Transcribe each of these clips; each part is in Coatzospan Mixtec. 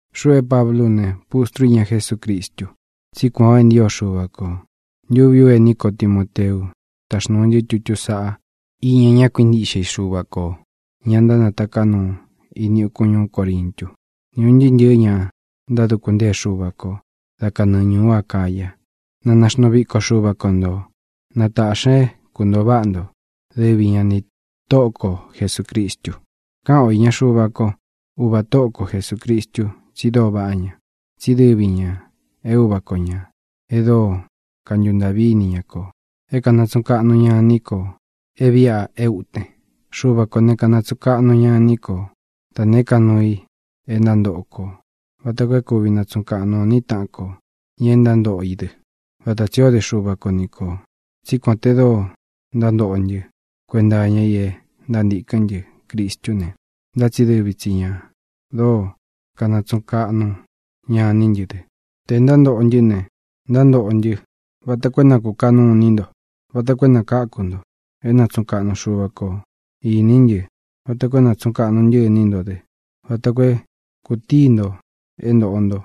Xuꞌu é Pablú u ne, pustrú u iña Jesúcristu, tsí kuān o e ntío Xuva kō. Ntuví u ení ko Timoteu táxnūu ntɨ́ tutú saꞌá iña ña kuíntiꞌxe i Xuva kō, ña ntánataká nuu ini ukun ñuú Corintu, ni un ntɨɨ́ ntɨ̄ɨ́ ña ntáduku ntée Xuva ko da kanɨɨ ñūú Acaya. Na naxnuu viko Xuva ko ntō. Na tāꞌxi ña é kuntōo váꞌa nto, dɨvi ña nī Tóꞌo ko Jesūcristu. Káꞌan o ni Xuva ko, uvā Tóꞌo ko Jesūcristu, tsi dóo vaꞌá ña. Tsí dɨvi ñā é uva ko ñā e dóo kantuntaꞌví ini ña kō, é kanatsuꞌun kaꞌnu ña iní kō é vīꞌa é uten. Xuva kō ne, kanatsuꞌun kaꞌnu ña iní ko da nēé ka nuu i e ntántoꞌo kō vata koo é kūvi natsuꞌun kaꞌnu o iní taꞌan ko, ña e ntántoꞌo i dɨ, vata tsī ó de Xuva ko ni kō. Tsí kuān te dóo ntántoꞌo ntɨ́ kuenta iña i e ntántīkɨ́n ntɨ Cristú ne, ntá tsi dɨvi tsi ñā dóo kanatsuꞌun kaꞌnu ña iní ntɨ dɨ. Tē ntántoꞌo ntɨ́ ne, ntántoꞌo ntɨ́ vata koo é nākuꞌun kaꞌnu iní nto, vata koo é nākáku nto. É nátsuꞌun kaꞌnu Xuva kō iní ntɨ vata koo é nātsuꞌun kaꞌnu ntɨ́ iní nto dɨ vata koo é kutíi nto é ntoꞌo nto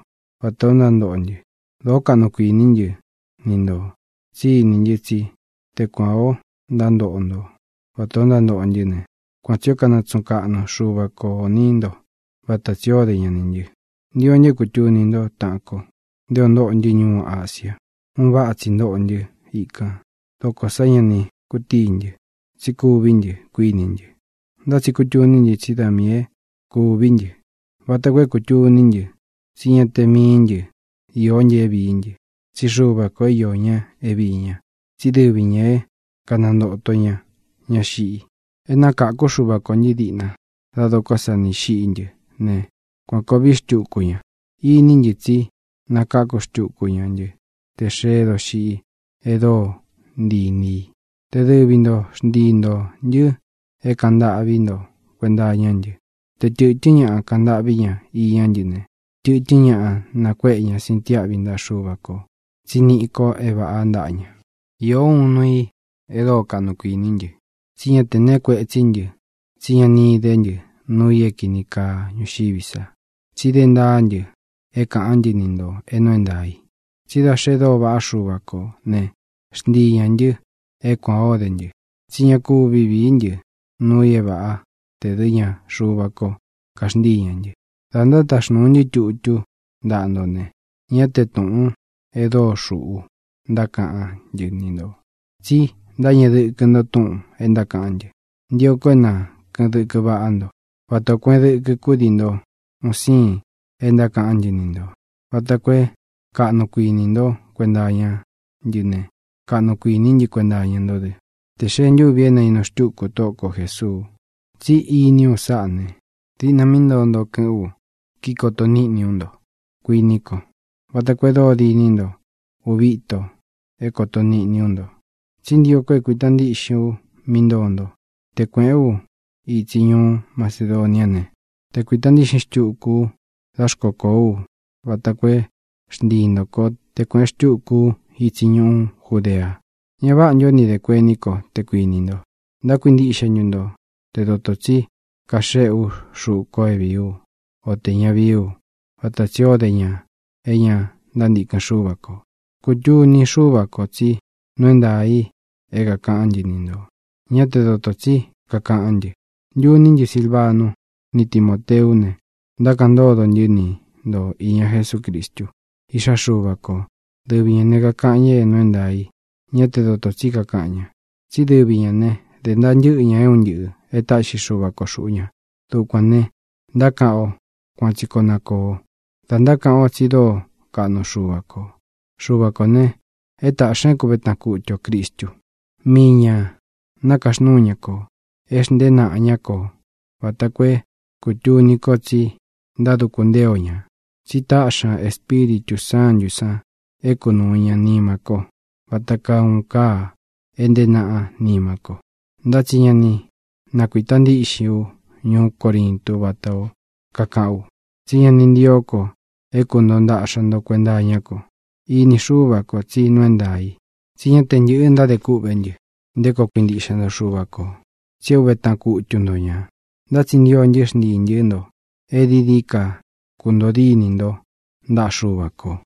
vatā o ntántoꞌo ntɨ. Dōó kaꞌnu kuiní ntɨ ni ntō tsí iní ntɨ tsí te kuān o ntántoꞌo nto vatā o ntántoꞌo ntɨ́ ne, kuan tsī ó kanatsuꞌun kaꞌnu Xuva ko inī ntó vata tsī ó de ña nī ntɨ. Ntio ntɨ é kūtuni ntó, taꞌan ko, nté ō ntóꞌo ntɨ́ ñuú Asia. Un váꞌa tsi ntóꞌo ntɨ íkān. Dókō sá ña ni kutíi ntɨ. Tsí kūví ntɨ, kuíni ntɨ. Ntá tsi kutuní ntɨ tsí da miī é kūví ntɨ, vata koo é kūtuní ntɨ tsí ña te mií ntɨ īó ntɨ é vīí ntɨ, tsí Xuva kō é iō ña é viī ña, tsí dɨvi ñā é kanantōto ña ña xiꞌi. É nakākú Xuva kō ntɨ́ diꞌna dá dokó sa nī xiꞌí ntɨ ne, kuān koo vií xtukú ña. Iní ntɨ tsí nakāku xtúku ña ntɨ́ tē xeé doxiꞌi e dóo ntii īni í, te dɨvi nto xntii ntō ntɨ́ é kāꞌan ntâꞌví nto kuenta iñá ntɨ. Te tɨ̄tɨ́n ñaꞌa kaꞌan ntâꞌví ña iñá ntɨ ne, tɨ̄tɨ́n ñaꞌa nakuéꞌe ña sintiáꞌvi ntaꞌa Xuva kō tsi niꞌí ko é vāꞌá ntaꞌa ña. Īó uun nuu i e dóo kaꞌnu kuiní ntɨ: tsi ñá te nēe kuetsí ntɨ tsí ña ni idé ntɨ nuu i é kīni kaa ñuxiví sa. Tsi dé ntaá ntɨ é kāꞌán ntɨ ni ntō é nuu é ntaā i. Tsi da xe dóo vaꞌá Xuva kō né, xntii ñā ntɨ é kuān o dé ntɨ, tsí ña kúvi vīí ntɨ nuu i é vāꞌá tē dɨ́ ña Xuva kō kaxntíi ña ntɨ. Dā ntátaxnūu ntɨ́ tutú ntaꞌa nto ne, ñá te tūꞌun e dóo xūꞌu ntákaꞌán ntɨ ni ntō, tsi ntáñeꞌe dɨkɨ nto túꞌūn é ntákaꞌán ntɨ. Ntio ko é na kɨ̄ꞌɨn dɨkɨ váꞌa nto, vatā o kueꞌen dɨkɨ kúdii nto un siin e ntákaꞌán ntɨ ni ntō, vata koo é kaꞌnu kuinī ntó kuenta iñá ntɨ ne, kaꞌnu kuiní ntɨ kuenta iña ntó dɨ, tē xee ntúvi é nainu xtúku Tóꞌo ko Jēsuu. Tsí iní u sáꞌā ne, diꞌna mí ntoo nto kɨ̄ꞌɨn u kíkoto niꞌni ú nto, kuíni kó, vata koo e dóo diní nto uvi íto é kōto niꞌni ú nto. Tsi ntío ko é kuīta ntíꞌxin u mí ntoo nto te kuēꞌén u itsi ñuú Macedoniá ne, te kuīta ntíꞌxin xtúku ú da xkókoo ú, vata koo é xntii ntō kó te kuēꞌen xtúku ú itsi ñuú Judea. ¿Ña váꞌa ntū ó ni dē kuení ko, te kuinī nto? ¿Ntákuintiꞌxe ntu nto te dotō tsí kaxéꞌe ú xuꞌu ko é vīí u, o tē ña vií u, vata tsī ó de ña é ña ntántīkɨn Xúva kō? Kutuni Xúva kō tsí nuu é ntaā i é kākaꞌán ntɨ ni ntō, ñá te dotō tsí kakaꞌán ntɨ. Ntuní ntɨ Silvanu ni Timóteú ne, ntákaꞌan ntódo ntɨ́ ni nto īña Jesúcristu, Iꞌxá Xuva kō. Dɨvi ñā ne, kakaꞌan ña é nuu é ntaā i, ñá te dotō tsí kakaꞌan ña. Tsí dɨvi ñā ne, dē ntaa ntɨ́ꞌɨ ña é un ntɨꞌɨ̄ e táꞌxi Xúva kō xuꞌu ña. Dukuān ne, ntákaꞌan ō “Kuan tsi koo na kōo” da ntákaꞌan o tsí dóo kaꞌnu Xuva kō. Xuva kō ne, é tāꞌxi ña é kuve taꞌan kūtu o Cristu. Mii ñā nákaxnúu ña kō. É xntēé naꞌa ñá ko vata koo é kūtuni ko tsi ntáduku ntée o ñā. Tsi táꞌxi ña Espíritū Sántū san é kunūu ña nima ko vata kaa uun káa é ntēé naꞌa nima ko. Ntá tsi ña ni nákuita ntiꞌxin ú ñuú Corintu vatā ó kakaꞌán u, tsí ña ni ntío ko é kuntōo ntáꞌxa nto kuenta iñá ko. Ini Xúva kō tsí nuu é ntaā i. Tsi ñá te ntɨ̄ꞌɨ ntádē kûꞌvé ntɨ nté koo kuintiꞌxe nto Xuva kō, tsi é ūve táꞌan kutu nto ñā. Ntá tsi ntio ntɨ́ xntiī ntɨ́ nto e dií dií ka kuntōo díni nto ntaꞌa Xuva kō.